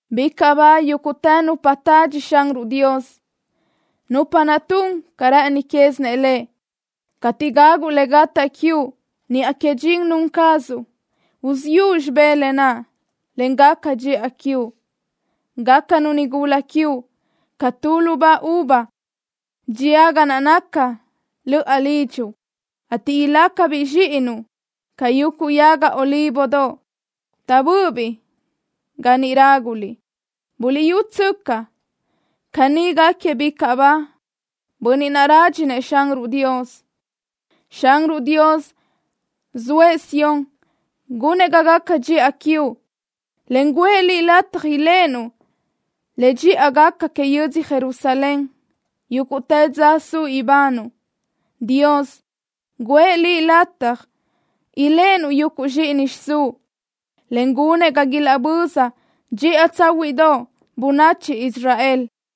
Bicaʼ ba yúguʼtë nupa tadxi Xanruʼ Dios, nupa naʼ tun ca rë́ʼëni quézinëʼ Lëʼ. Cateʼ gaguʼ le gataʼ quiuʼ niʼa que dxin nun cazuʼ, uziʼu xibé lë naʼ, en gaca dxiʼa quiuʼ. Gácanu nigula quiuʼ ca tu lubá uva dxía ga naca löʼa lidxuʼ, ateʼ ilácabiʼ zxíʼinuʼ ca yuguʼ yaga olívodoʼ taʼbö́ʼöbiʼ ga niʼ ráguliʼ. Buliʼyútsöcaʼ, caní gáquiëʼ bicaʼ ba bönniʼ naʼ rádxinëʼ Xanruʼ Dios. Xanruʼ Dios zoëʼ Sión gunëʼ ga gaca dxiʼa quiuʼ, en guʼë liʼ lataj iléʼenuʼ le dxiʼa gaca que yödzö Jerusalén yúguʼtë dza suʼ ibanuʼ. Dios guʼë liʼ lataj iléʼenuʼ yuguʼ zxíʼini xiʼsúʼ, en gunëʼ ga ilaʼböza dxiʼa tsáhuiʼdoʼ bönachi Israel.